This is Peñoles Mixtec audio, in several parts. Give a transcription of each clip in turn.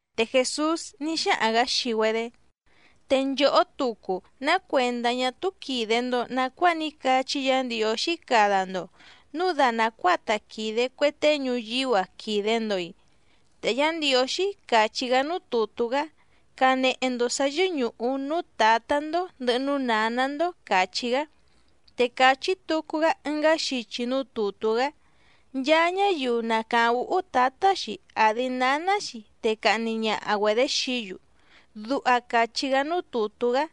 Te Jèsús ní xáhaⁿ‑gǎ xii‑güedé: —Te nchòhó tucu, ¿ná cuèndá ñá túú quìde‑ndo nacuáa ní cachí Yǎ Ndiǒxí cada‑ndo, núu da nàcuáa ta quìde cue tée ñuyíú‑a quìde‑ndo‑i? Te Yá Ndiǒxí càchí‑gá núú tùtú‑gá: “Canehe‑ndo sǎ yɨ́ñùhu núú tǎtá‑ndó ndɨ̀hɨ núú nǎná‑ndó”, càchí‑gá. Te càchí tucu‑gá ɨngá xichi núú tùtú‑gá: “Nchaa ñáyiu na càháⁿ úhú tǎtá‑xi àdi náná‑xi te cahni ñaha‑güedě xií‑yu”, duha càchí‑gá núú tùtú‑gá.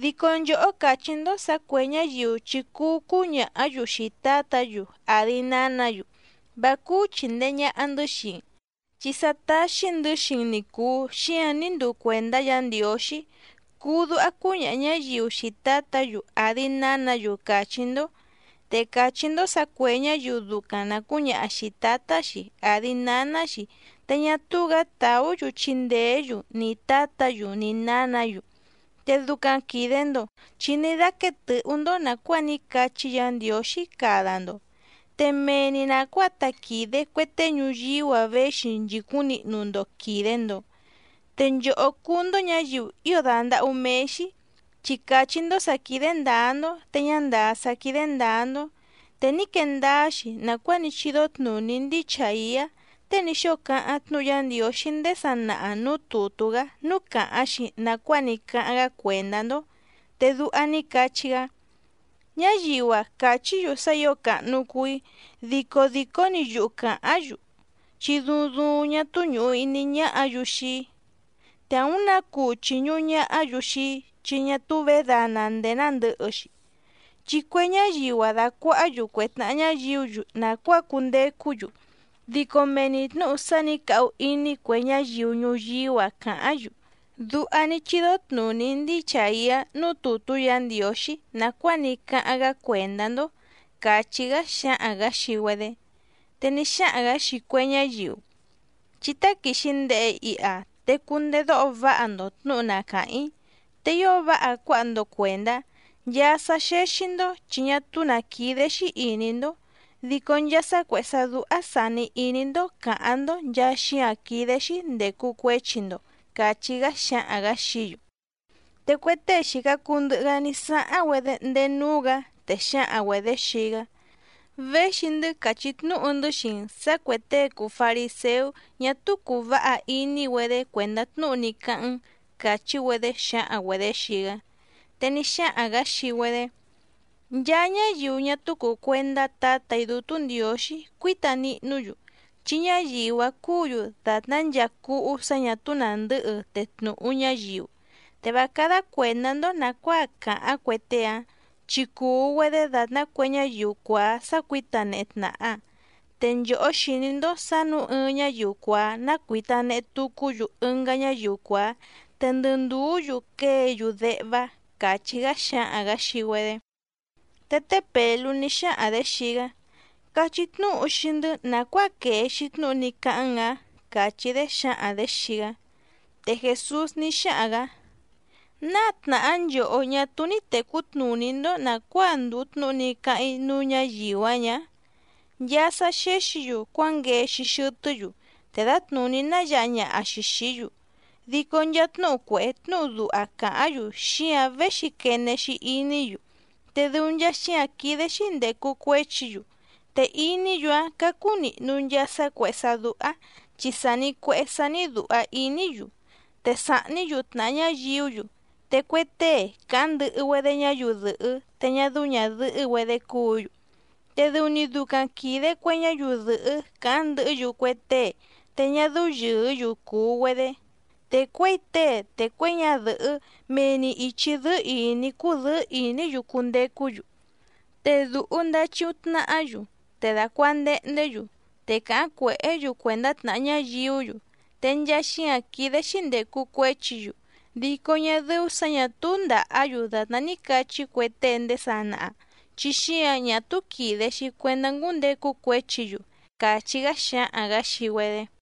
Dico nchòhó càchí‑ndó sǎ cuè ñáyiu chi cuu cúñàhá‑yu xii tǎtǎ‑yu àdi nánǎ‑yu: “Vá cúú chìndee ñaha‑ndɨ́ xii‑n, chi sá táxí‑ndɨ̌ xii‑n ni cùu, xíǎⁿ ní nduu cuèndá Yǎ Ndiǒxí”, cuu duha cúñaha ñǎyiu xii tǎtǎ‑yu àdi nánǎ‑yu càchí‑ndó. Te càchí‑ndó sǎ cuè ñáyiu ducaⁿ na cǔñaha xìi tátá‑xi àdi náná‑xi te ñá túú‑gǎ tàú‑yu chindèé‑yu ni tǎtǎ‑yu ni nǎnǎ‑yu. Te ducaⁿ quìde‑ndo chi ní dáquéé tɨ̌hú‑ndó nàcuáa ní cachí Yǎ Ndiǒxí cada‑ndo, te mee‑ni nàcuáa ta quìde cue tée ñuyíú‑a véxi nchìcúⁿ nihnu‑ndo quìde‑ndo. ¡Te nchòhó cúú‑ndó ñǎyiu ío dàndahú méé‑xí, chi càchí‑ndó sǎ quídé ndǎá‑ndó te ñá ndàá sá quídé ndǎá‑ndó! Te ní quee ndáá‑xi nàcuáa ní chídó tnùní ndíi Chàiá tée ní xóo cáháⁿ tnúhu Yá Ndiǒxí ndéé sanaha nǔú tùtú‑gá núú càháⁿ‑xi nàcuáa ní cáháⁿ‑gá cuèndá‑ndó, te duha ní cachí‑gá: Ñáyiu‑a càchí‑yu sá ǐo càhnu cuu‑í dico dìcó‑ni yuhu càháⁿ‑yu, chi duuⁿ duuⁿ ñá túú ñùhu iní ñáhǎ‑yu xii‑í. Te àúⁿ nǎ cuu chìñuhu ñahá‑yu xii‑í chi ñá túú vědana ndèé nándɨ̌hɨ‑xi, chi cue ñáyiu‑a dàcuahá‑yu cue tnàha ñáyiú‑yu nàcuáa cundecú‑yu, dico mee‑ni tnǔhu sá nǐ cahu iní cue ñáyiu ñuyíú‑a càháⁿ‑yu. Duha ní chídó tnùní ndíi Chàiá núú tùtú Yǎ Ndiǒxí nàcuáa ní cáháⁿ‑gá cuèndá‑ndó —càchí‑gá xǎhaⁿ‑gǎ xii‑güedé. Te ní xáhaⁿ‑gǎ xii cue ñáyiu: —Chí táquìxi ndehe iha, te cundedóho váha‑ndo tnǔhu na càháⁿ‑í, te ío váha cuáha‑ndo cuèndá. Nchaa sá xéxí‑ndó chi ñá túú nǎ quídé‑xí ìní‑ndó, dico nchaa sá cuèhé sá dúhá sàni iní‑ndó càháⁿ‑ndó nchàa xíǎⁿ quídé‑xí ndècu cuéchi‑ndo —càchí‑gá xǎhaⁿ‑gǎ xií‑yu. Te cue tée xìca cuu ndɨhɨ‑gá ní sáháⁿ‑güedé ndéé núú‑gǎ, te xǎhaⁿ‑güedě xii‑gá: —Véxi‑ndɨ́ càchí tnúhu‑ndɨ́ xii‑n sǎ cuè tée cùu fariséú ñá túú cùu váha iní‑güedé cuèndá tnúhu ní cáháⁿ‑n —càchí‑güedé xǎhaⁿ‑güedě xii‑gá. Te ní xáhaⁿ‑gǎ xii‑güedé: —Nchaa ñáyiu ñá túú cùu cuendá Tǎtà‑í Dútú Ndiǒxí cuíta nihnú‑yu, chi ñáyiu‑áⁿ cúǔ‑yu dàtná nchaa cúhú sǎ ñà túú nàndɨ́hɨ te tnùhu ñáyiu. Te vá cádá cuèndá‑ndó nàcuáa càháⁿ cue tée‑áⁿ, chi cùu‑güedé dàtná cue ñáyiu cuàá sácuǐta nehe tnàha. Te nchòhó xìní‑ndó sǎ nǔu ɨɨⁿ ñáyiu cuàá ná cuítá nèhe tucú‑yu ɨngá ñáyiu cuàá, te ndɨ ndùú‑yu quée‑yu déhvá —càchí‑gá xǎhaⁿ‑gǎ xii‑güedé. Te té Pèlú ní xáhaⁿ‑dě xii‑gá: —Cachí tnúhu xii‑ndɨ́ nàcuáa quèe‑xi tnúhu ní cáháⁿ‑n‑ǎⁿ —càchí‑dé xǎhaⁿ‑dě xii‑gá. Te Jèsús ní xáhaⁿ‑gǎ: —¿Náa tnàhá nchòhó ñá túú ní tècú tnùní‑ndó nàcuáa ndùu tnúhu ní cáháⁿ‑í núú ñǎyiu‑ǎⁿ ñǎ? Nchaa sá xéxǐ‑yu cuánguee‑xi xɨtɨ́‑yu, te dǎtnùní náyǎha ñaha‑xi xìí‑yu. Dico nchaa tnúhu cuèhé tnúhu duha càháⁿ‑yu xíǎⁿ véxi quene‑xi iní‑yu, te dɨu nchaa xíǎⁿ quídé‑xí ndècu cuéchi‑yu. Te iní‑yu‑áⁿ cácú nìhnu nchaa sá cuèhé sá dúhá, chi sàni cuehé sání dùha iní‑yu, te sàhní‑yu tnàha ñáyiú‑yu, te cue tée càháⁿ ndɨhɨ‑güedé ñáyiu dɨ̀hɨ́ te ñá dɨ́ú ñàdɨhɨ́‑güedé cúǔ‑yu. Te dɨu‑ni ducaⁿ quìde cue ñáyiu dɨ̀hɨ́ càháⁿ ndɨhɨ́‑yu cue tée te ñá dɨ́ú yɨ̀ɨ́‑yu cùu‑güedé, te cuěi tée te cuěi ñadɨ̀hɨ́ mee‑ni ìchi dɨ́ɨ́ ìní cúdɨ̌ɨ́ ìní‑yu cundecú‑yu, te dùhu ndachiuⁿ tnahá‑yu, te dàcuandehndé‑yu, te càháⁿ cuèhé‑yu cuèndá tnàha ñáyiú‑yu. Te nchaa xíǎⁿ quídé‑xí ndècu cuéchi‑yu, dico ñá dɨ́ú sǎ ñà túú ndàhá‑yu dàtná ní cachí cue tée ndéé sanaha, chi xíǎⁿ ñá túú quìde‑xi cuendá ngúndecu cuéchi‑yu —càchí‑gá xǎhaⁿ‑gǎ xii‑güedé.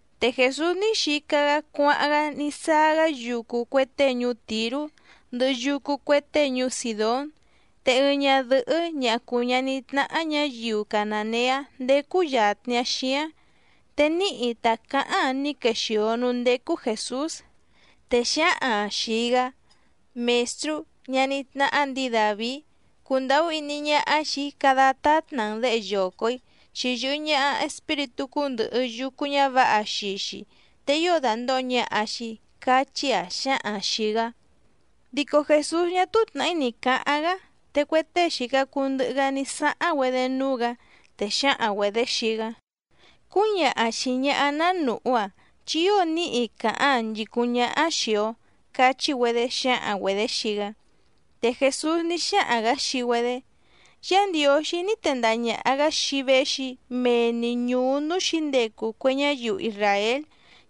Te Jèsús ní xica‑gá cuáháⁿ‑gá ní sáá‑gá yucu cue tée ñuú Tìrú, ndɨhɨ yucu cue tée ñuú Sìdón. Te ɨɨⁿ ñadɨ̀hɨ́ ñaha cùu ñaní tnáhá ñǎyiu canàneá ndécú yàtni‑aⁿ xíáⁿ, te níhi ta càháⁿ‑aⁿ ní quexìo núú ndécú Jèsús, te xǎhaⁿ‑aⁿ xìi‑gá: —¡Mèstrú, ñaní tnáhá ndǐi Dàvií, cundàhú iní ñáhá xìi‑í cada tátna‑n děhe yoco‑ǐ! Chi yɨ̀hɨ ñaha espíritú cúndɨ̀hɨ yucu ñávǎha xii‑xi te ío dàndoho ñaha‑xi —cachí‑aⁿ xǎhaⁿ xìi‑gá. Dico Jèsús ñá túú tnàhí ni cǎháⁿ‑gá, te cue tée xìca cuu ndɨhɨ‑gá ní sáháⁿ‑güedé núú‑gǎ, te xǎhaⁿ‑güedě xii‑gá: —Cúñaha xìi ñaha‑áⁿ ná nùhú‑aⁿ, chi ío níhi càháⁿ‑aⁿ nchìcúⁿ ñáhá‑áⁿ xìi‑o —cachí‑güedé xǎhaⁿ‑güedě xii‑gá. Te Jèsús ní xáhaⁿ‑gǎ xii‑güedé: —Yá Ndiǒxí ní tendaha ñàha‑gá xii‑í véxi‑í mee‑ni ñùú núú xǐndecu cue ñáyiu isràél,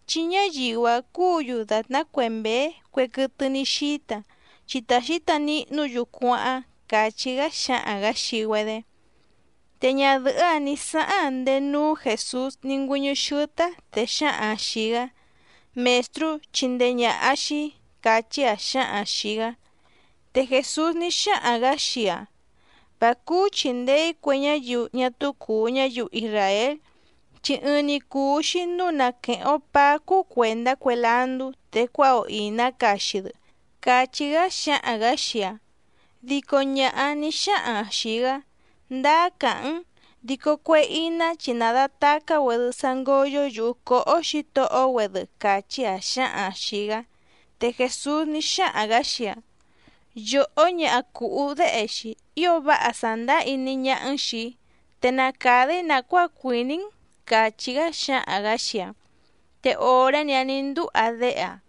chi ñáyiu‑áⁿ cúǔ‑yu dàtná cue mběé cue quɨtɨ ní xíta, chi ta xǐta nihnú‑yu cuáháⁿ —càchí‑gá xǎhaⁿ‑gǎ xii‑güedé. Te ñadɨ̀hɨ́‑áⁿ nǐ sáháⁿ‑aⁿ ndéé núú Jèsús ní ngüɨ́ñɨ́ xɨ́tɨ́‑áⁿ, te xǎhaⁿ‑aⁿ xìi‑gá: —¡Mèstrú, chindee ñàha xii‑í! —càchí‑aⁿ xǎhaⁿ‑aⁿ xìi‑gá. Te Jèsús ní xáhaⁿ‑gǎ xii‑aⁿ: —Vá cúú chìndee‑í cue ñáyiu ñá túú cùu ñáyiu isràél, chi ɨɨⁿ‑ni cùu‑xi núu na quèheⁿ‑o paá cúú cuèndá cue landú te cuáha‑o ìná caxi‑dɨ —càchí‑gá xǎhaⁿ‑gǎ xii‑aⁿ. Dico ñaha‑áⁿ nǐ xáhaⁿ‑aⁿ xìi‑gá: —Ndáá càháⁿ‑n, dico cue iná chi nàdatacá‑güedɨ sá ngóyó yùhu cóhó xǐtohó‑güedɨ —càchí‑aⁿ xǎhaⁿ‑aⁿ xìi‑gá. Te Jèsús ní xáhaⁿ‑gǎ xii‑aⁿ: —¡Yòhó ñaha cùhú déhe‑xi, ío váha sàndáá iní ñáhá‑n xìi‑í! Te na càda‑í nàcuáa cuìní‑n —càchí‑gá xǎhaⁿ‑gǎ xii‑aⁿ. Te òré‑ni‑áⁿ nǐ ndúha déhe‑aⁿ.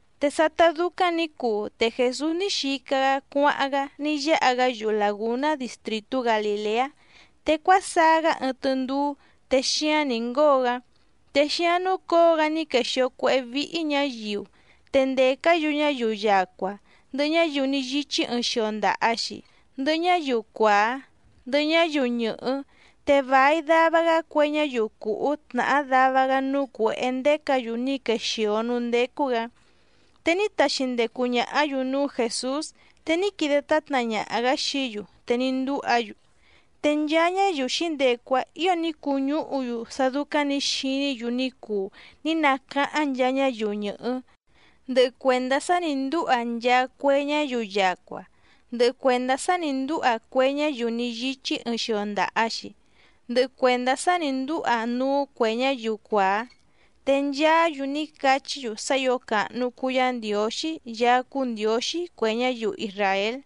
Te sátá dúcáⁿ nǐ cuu te Jèsús ní xica‑gá cuáháⁿ‑gá ní yáha‑gá yuhu làgúná distrìtú Galìleá, te cuásaá‑gá ɨɨⁿ tɨndúú te xíáⁿ nǐ ngóo‑gá. Te xíáⁿ núcǒo‑gá ní quexìo cuéhé víhí ñǎyiu, te ndècá‑yu ñáyiu yacua, ndɨhɨ ñáyiu ní yíchí ɨɨⁿ xio ndaha‑xi, ndɨhɨ ñáyiu cuàá, ndɨhɨ ñáyiu ñɨ̀hɨ́, te vài dava‑gá cue ñáyiu cùhú tnàhá dava‑gá núú cuěhé ndécǎ‑yu ní quexìo núú ndécú‑gǎ. Te ní taxi ndecu ñàhá‑yu núú Jèsús te ní quide tátna ñaha‑gǎ xií‑yu te ní ndúha‑yu. Te nchaa ñáyiu xǐndecu‑áⁿ ǐo ní cuñúhu‑yu sá dúcáⁿ nǐ xiní‑yu ní cuu ní nacáháⁿ nchaa ñáyiu ñɨ̀hɨ́, ndɨhɨ cuèndá sá nǐ ndúha nchaa cue ñáyiu yacua, ndɨhɨ cuèndá sá nǐ ndúha cue ñáyiu ní yíchí ɨɨⁿ xio ndaha‑xi, ndɨhɨ cuèndá sá nǐ ndúha núú cuè ñáyiu cuàá. Te nchaá‑yu ní cachí‑yu sá ǐo càhnu cuu Yá Ndiǒxí Yaá cúú Ndiǒxí cue ñáyiu isràél.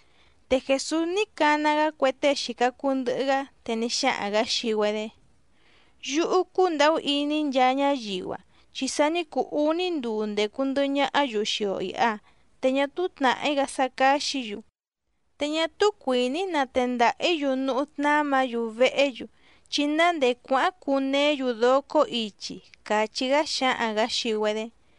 Te Jèsús ní cana‑gá cue tée xìca cuu ndɨhɨ‑gá, te ní xáhaⁿ‑gǎ xii‑güedé: —Yúhú cúndàhú iní‑í nchaa ñáyiu‑a, chi sa ní cuu úní nduu ndècu ndɨhɨ ñahá‑yu xii‑o ìha, te ñá túú tnàhí‑gá sá cáxǐ‑yu, te ñá túú cuìní‑í natendaha‑ǐ‑yu núhú tnámǎ‑yu vehé‑yu, chi ná ndèé cuáháⁿ cuneé‑yu docó ichi —càchí‑gá xǎhaⁿ‑gǎ xii‑güedé.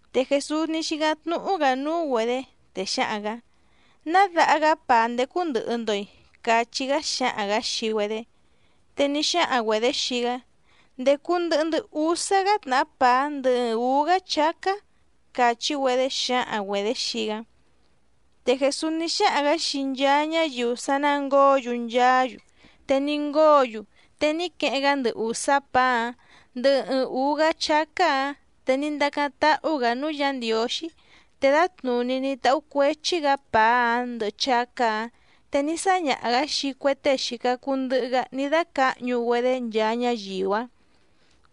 Te Jèsús ní xícáⁿ tnúhú‑gǎ núú‑güedě, te xǎhaⁿ‑gǎ: —¿Ná daha‑gá pàá ndécú ndɨ̀hɨ‑ndo‑i? —cachí‑gá xǎhaⁿ‑gǎ xii‑güedé. Te ní xáhaⁿ‑güedě xii‑gá: —Ndècu ndɨhɨ‑ndɨ́ úsá‑gá tnàhá pàá ndɨhɨ ɨɨⁿ ǔú‑gá chácá —càchí‑güedé xǎhaⁿ‑güedě xii‑gá. Te Jèsús ní xáhaⁿ‑gǎ xii nchaa ñáyiu sá ná ngǒo‑yu nchaá‑yu, te ní ngóo‑yu. Te ní queheⁿ‑gá ndɨ ùsá pàá‑áⁿ ndɨ ɨɨⁿ ǔú‑gá chácá‑ǎⁿ, te ní ndacáⁿ táhú‑gǎ núú Yǎ Ndiǒxí, te dǎtnùní ní táhú cuèchi‑gá pàá‑áⁿ ndɨhɨ chácá‑ǎⁿ te ní sáñaha‑gǎ xii cue tée xìca cuu ndɨhɨ‑gá ní dácǎhñu‑güedé nchaa ñáyiu‑áⁿ.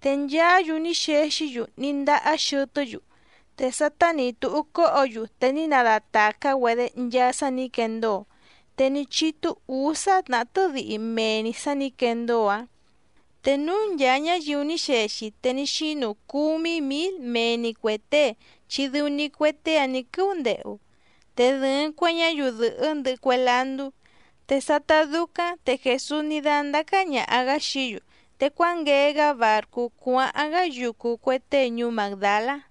Te nchaá‑yu ní xexí‑yu ní ndahá xɨtɨ́‑yu. Te sátá nǐ túhú cóhǒ‑yu te ní nadatàcá‑güedé nchaa sá nǐ quendóo, te ní chítú ǔsá tnàhá tɨ́dihi mee‑ni sǎ nǐ quendóo‑áⁿ. Te núú ncháá ñǎyiu ní xexi te ní xínu cúmí mǐl mee‑ni cuè tée chi dɨu‑ni cue tée‑áⁿ nǐ quɨ́úndehu, te dɨ̀ɨⁿ cue ñáyiu dɨ̀hɨ́ ndɨhɨ cue landú. Te sátá dúcáⁿ te Jèsús ní dándácá ñàha‑gá xií‑yu, te cuánguee‑gá bàrcú cuáháⁿ‑gá yucu cue tée ñuú Màgdalá.